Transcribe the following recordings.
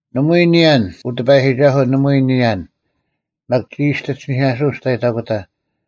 ᓇᒪᐎᔾ ᓂᔭᓐ, ᐅ ᑎᐸᔨᒋᒐᓱᐤ, ᓇᒪᐎᔾ ᓂᔭᓐ, ᒪᒃ ᒋᔾ ᒋᑦ ᐃᓯᓂᐧᑲᓱᐅᓐ ᒋᔅᑕᔨᑕᑯᑕ,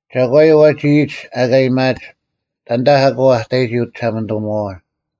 ᒐᒂᔪᐤ ᐛᒋ ᐃᔨᒡ ᐊᑲ ᐊᔭᒥᐊᒡ, “ᑕᓐᑕ ᐊᑯ ᐊ ᑕᔨᒋ ᐅᒋᓴᒪᓂᑐᒧᐛᐛ?”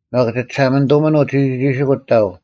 ᒪᒃ ᒋ ᒋᓴᒪᓂᑐᒥᓇᐤ ᒋᒋᒋᓯᑯᒡ ᑕᐤ: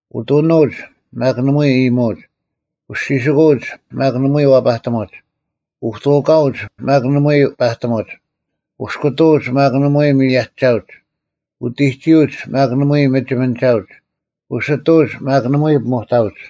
ᐅᑐᓄᐅᒡ, ᒪᒃ ᓇᒪᐎᔾ ᐃᔨᒧᐅᒡ: ᐅᔅᒋᓯᑯᐅᒡ, ᒪᒃ ᓇᒪᐎᔾ ᐛᐸᑎᒧᒡ: ᐅᑐᑲᐅᒡ, ᒪᒃ ᓇᒪᐎᔾ ᐸᑎᒧᒡ: ᐅᔅᑯᑐᐅᒡ, ᒪᒃ ᓇᒪᐎᔾ ᒥᔭᒋᒐᐅᒡ: ᐅᑎᒋᐅᒡ, ᒪᒃ ᓇᒪᐎᔾ ᒥᒋᒥᓂᒐᐅᒡ: ᐅᓯᑐᐅᒡ, ᒪᒃ ᓇᒪᐎᔾ ᐱᒧᑕᐅᒡ: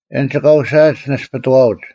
ᐊᓐᒡ ᑲ ᐅᓯᐊᒡ ᓇᔅᐱᑐᐛᐅᒡ;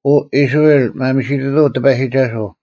ᐅ ᐃᔅᕋᐃᓪ, ᒪᒥᓯᑐᑐᐤ ᑎᐸᔨᒋᒐᓱᐤ: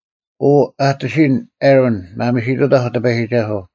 ᐅ ᐊᑎᓯᔨᓐ ᐊᕋᓐ, ᒪᒥᓯᑐᑕᐧᒄ ᑎᐸᔨᒋᒐᓱᐤ: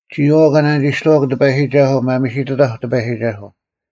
ᒋᔨᐛᐤ ᑲ ᓇᓂᒋᔅᑕᐛᒃ ᑎᐸᔨᒋᒐᓱᐤ, ᒪᒥᓯᑐᑕᐧᒄ ᑎᐸᔨᒋᒐᓱᐤ: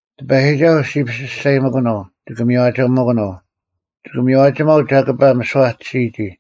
ᑎᐸᔨᒋᒐᓱᐤ ᔅᒋ ᐱᓯᔅᒐᔨᒥᑯᓄᐤ; ᒋᑭ ᒥᔽᒋᒥᑯᓄᐤ: ᒋᑭ ᒥᔽᒋᒪᐤ ᒐᑭᐸ ᒥᓯᐛ ᐊ ᑎᓯᔨᒋ;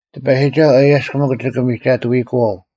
ᑎᐸᔨᒋᒐᓱᐤ ᐊᔭᔅᒃ ᒥᒄ ᒋᑭ ᒥᒐᑐᐃᑯᐛᐤ,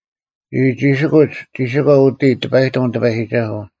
ᒋᒋᒋᓯᑯᒡ, ᒋᓯᒂ ᐅᑎ ᑎᐸᔨᑎᒻ ᑎᐸᔨᒋᒐᓱᐤ: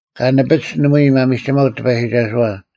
ᑲ ᓂᐱᒡ ᓇᒪᐎᔾ ᒪᒥᒋᒪᐅᒡ ᑎᐸᔨᒋᒐᓱᐛ,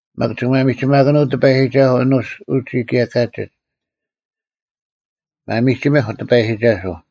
ᒪᒃ ᒋᑭ ᒪᒥᒋᒪᓄᐤ ᑎᐸᔨᒋᒐᓱᐤ ᐊᓄᒡ ᐅᒋ ᑭᔭ ᑲᒋᒡ᙮ ᒪᒥᒋᒥᐧᒄ ᑎᐸᔨᒋᒐᓱᐤ!